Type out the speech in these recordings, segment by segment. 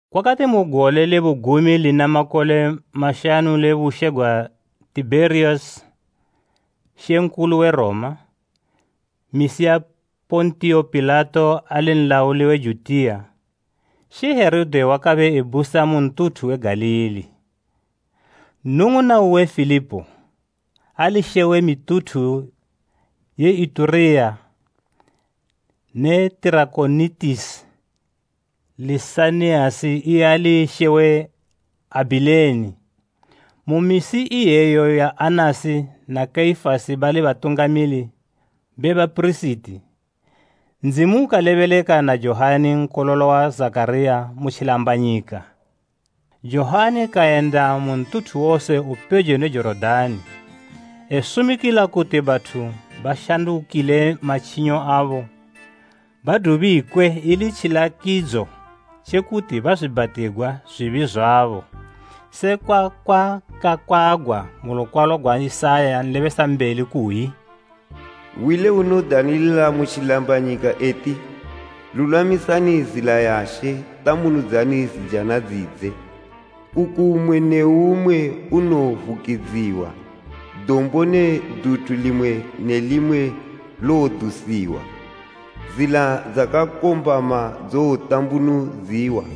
Kwakati mu gole le bugumi lina makole mashanu le bushe gwa Tibheriyasi (Mambo we Roma) misi ya Pontiyo Pilato ali nlauli we Judiya, she Herode wakabe ebusa mu ntuthu we Galili. Nnung'una uwe Filipo, ali she we mituthu ye Itureya ne Tirakonitisi, Lisaniyasi iye ali she we Abhileni, mu misi iyeyo ya Anasi na Kaifasi bali Batungamili be bapirisiti, Ndzimu ukalebeleka na Johani nkololo wa Zakhariya mu tjilambanyika. Johani kayenda mu ntuthu wose upejo ne Jorodani, esumikila kuti bathu bashandukile matjinyo abo badubikwe ili tjilakidzo tje kuti bazwiibhatigwa zwibi zwabo. Sekwa kwakakwagwa mu lukwalo gwa Isaya nlebesambeli kuyi, “Hwi le unodanilila mu tjilambanyika eti, ‘Lulwamisani zila ya She, tambunudzani zijana dzidze. Nkuku mmwe ne mmwe unowovukidziwa, dombo ne duthu limwe ne limwe lowodusiwa. Zila dzakakombama dzowotambunudziwa,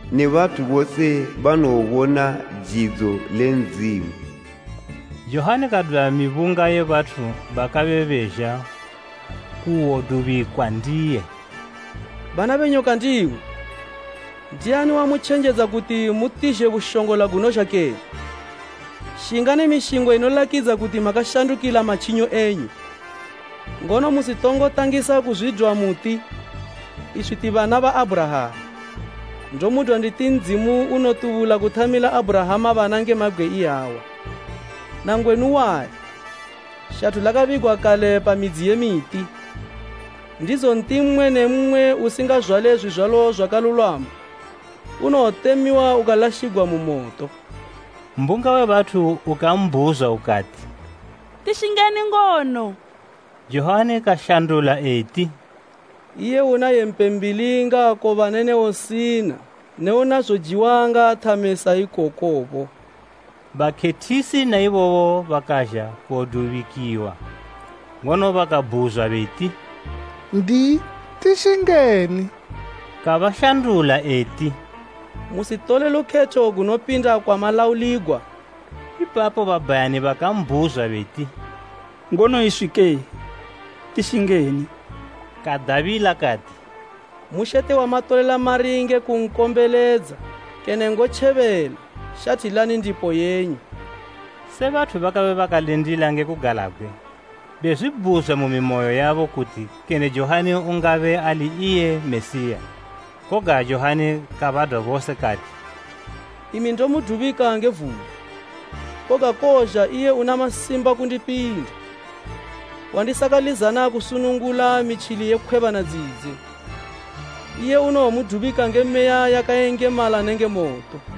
ne bathu bose banowobona jidzo le Ndzimu.’” Johani kadwa mibunga ye bathu bakabe bezha kuwodubikwa ndiye eti, “Bana be nyoka ndimwi! Ndiani wamutjenjedza, kuti mutizhe bushongola gunozha kene? Shingani mishingo inolakidza kuti makashandukila matjinyo enyu. Ngono musitongo tangisa kuzwidwa muti, ‘Iswi ti bana ba Abhurahama.’ Ndomudwa nditi Ndzimu unotubula kuthamila Abhurahama bana nge mabgwe iyawa. Nangwenu wali, shathu lakabigwa kale pa midzi ye miti, ndizo nti mmwe ne mmwe usingazwale zwizwalo zwakalulwama, unowotemiwa ukalashigwa mu moto.” Mbunga we bathu ukambhuzwa ukati, “Tishingeni ngono?” Johani kashandula eti, “Iye una yempe mbili ngaakobane ne usina ne una zojiwa ngaathame sa ikokobo.” Bakhethisi na ibobo bakazha kuwodubikiwa. Ngono bakabhuzwa beti, “N'diyi, tishingeni?” Kabashandula eti, “Musitole lukhetho gunopinda kwamalauligwa.” Ipapo babhayani bakambhuzwa beti, “Ngono iswike, tishingeni?” Kadabila kati, “Mushete wamatolela mari nge kunkombeledza kene ngotjebela, shathilani ndipo yenyu.” Bathu bakabe bakalindila nge kugalabgwe, bezwibhuzwa mu mimoyo yabo kuti kene Johani ungabe ali iye Mesiya. Koga Johani kabadwa bose kati, “Imi ndomudubika nge vula, koga kowozha iye una masimba kundipinda, wandisakalizana kusunungula mitjili ye khwebana dzidze. Iye unowomudubika nge Meya yakayengemala nenge moto.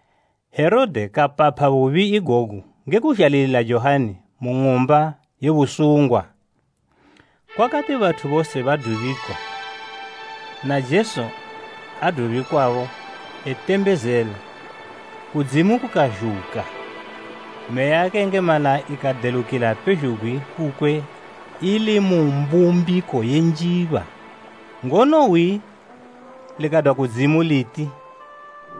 Herode kapapha bubi igogu nge kuzhalilila Johani mu ng'umba ye busungwa. Kukati bathu bose badubikwa, Jesu kadubikiwabo. Ngono Jesu kati etembezela, kudzimu kukazhuka, Meya yakayengemala ikadelukila pezhugwi kukwe ili mu mbumbiko ye njiba. Ngono hwi likadwa kudzimu liti,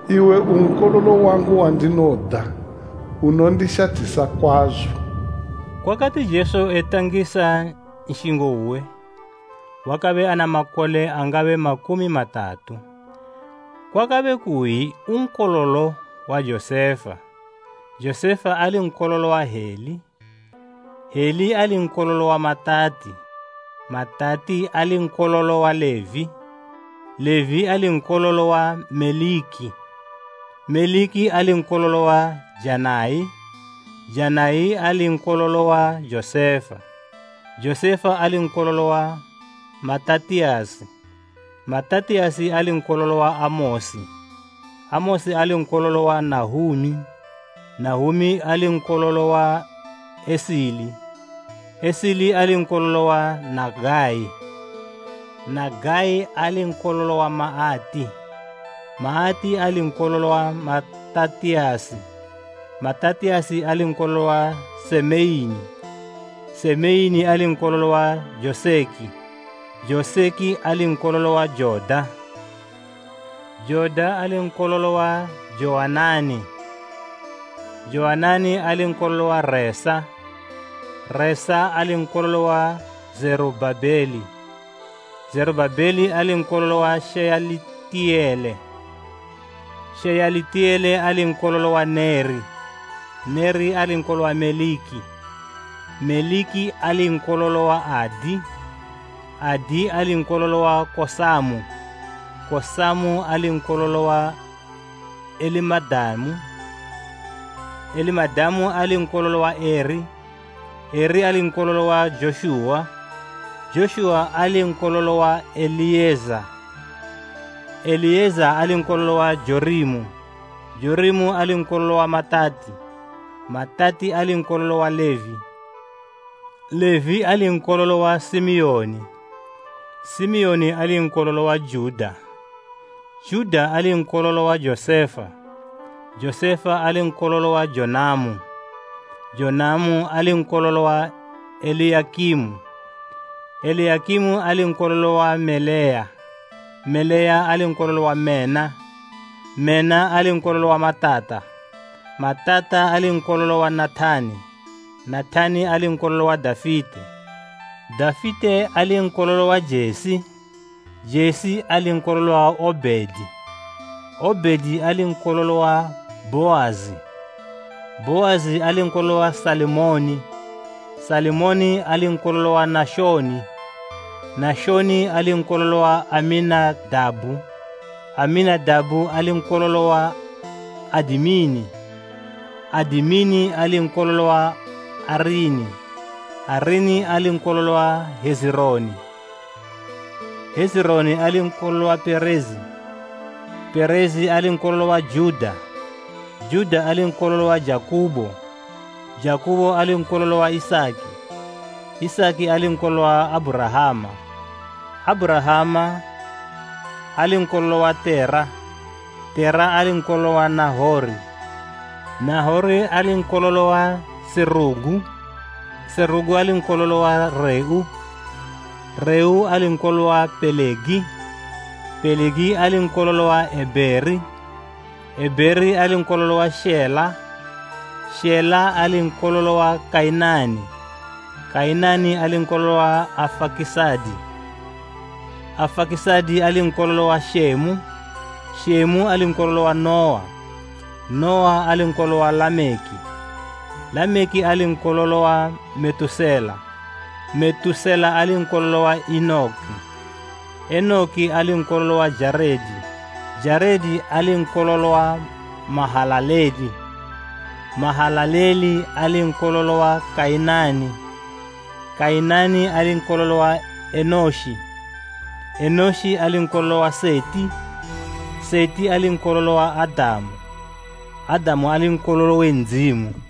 “Iwe u Nkololo wangu wandinoda, unondishathisa kwazo.” Kwakati Jesu etangisa nshingo uwe, wakabe ana makole angabe makumi matatu. Kwakabe kuyi nkololo wa Josefa, Josefa ali nkololo wa Heli, Heli ali nkololo wa Matati, Matati ali nkololo wa Levi, Levi ali nkololo wa Meliki, Meliki ali nkololo wa Janai, Janai ali nkololo wa Josefa, Josefa ali nkololo wa Matatiyasi, Matatiyasi ali nkololo wa Amosi, Amosi ali nkololo wa Nahumi, Nahumi ali nkololo wa Esili, Esili ali nkololo wa Nagai, Nagai ali nkololo wa Maati, Maati ali nkololo wa Matatiyasi, Matatiyasi ali nkololo wa Semeini, Semeini ali nkololo wa Joseki, Joseki ali nkololo wa Joda, Joda ali nkololo wa Jowanani, Jowanani ali nkololo wa Resa, Resa ali nkololo wa Zerubhabeli, Zerubhabeli ali nkololo wa Sheyalitiyele, Sheyalitiyele ali nkololo wa Neri, Neri ali nkololo wa Meliki, Meliki ali nkololo wa Adi, Adi ali nkololo wa Kosamu, Kosamu ali nkololo wa Elimadamu, Elimadamu ali nkololo wa Eri, Eri ali nkololo wa Joshuwa, Joshuwa ali nkololo wa Eliyeza, Eliyeza ali nkololo wa Jorimu, Jorimu ali nkololo wa Matati, Matati ali nkololo wa Levi, Levi ali nkololo wa Simiyoni, Simiyoni ali nkololo wa Juda, Juda ali nkololo wa Josefa, Josefa ali nkololo wa Jonamu, Jonamu ali nkololo wa Eliyakimu, Eliyakimu ali nkololo wa Meleya, Meleya ali nkololo wa Mena, Mena ali nkololo wa Matata, Matata ali nkololo wa Nathani, Nathani ali nkololo wa Dafite, Dafite ali nkololo wa Jesi, Jesi ali nkololo wa Obhedi, Obhedi ali nkololo wa Bhoazi, Bhoazi ali nkololo wa Salimoni, Salimoni ali nkololo wa Nashoni, Nashoni ali nkololo wa Aminadabhu, Aminadabhu ali nkololo wa Adimini, Adimini ali nkololo wa Arini, Arini ali nkololo wa Hezironi, Hezironi ali nkololo wa Perezi, Perezi ali nkololo wa Juda, Juda ali nkololo wa Jakubo, Jakubo ali nkololo wa Isaki, Isaki ali nkololo wa Abhurahama, Abhurahama ali nkololo wa Tera, Tera ali nkololo wa Nahori, Nahori ali nkololo wa Serugu, Serugu ali nkololo wa Reu, Reu ali nkololo wa Pelegi, Pelegi ali nkololo wa Ebheri, Ebheri ali nkololo wa Shela, Shela ali nkololo wa Kainani, Kainani ali nkololo wa Afakisadi, Afakisadi ali nkololo wa Shemu, Shemu ali nkololo wa Nuwa, Nuwa ali nkololo wa Lameki, Lameki ali nkololo wa Metusela, Metusela ali nkololo wa Enoki, Enoki ali nkololo wa Jaredi, Jaredi ali nkololo wa Mahalaleli, Mahalaleli ali nkololo wa Kainani, Kainani ali nkololo wa Enoshi, Enoshi ali nkololo wa Seti, Seti ali nkololo wa Adamu, Adamu ali nkololo we Ndzimu.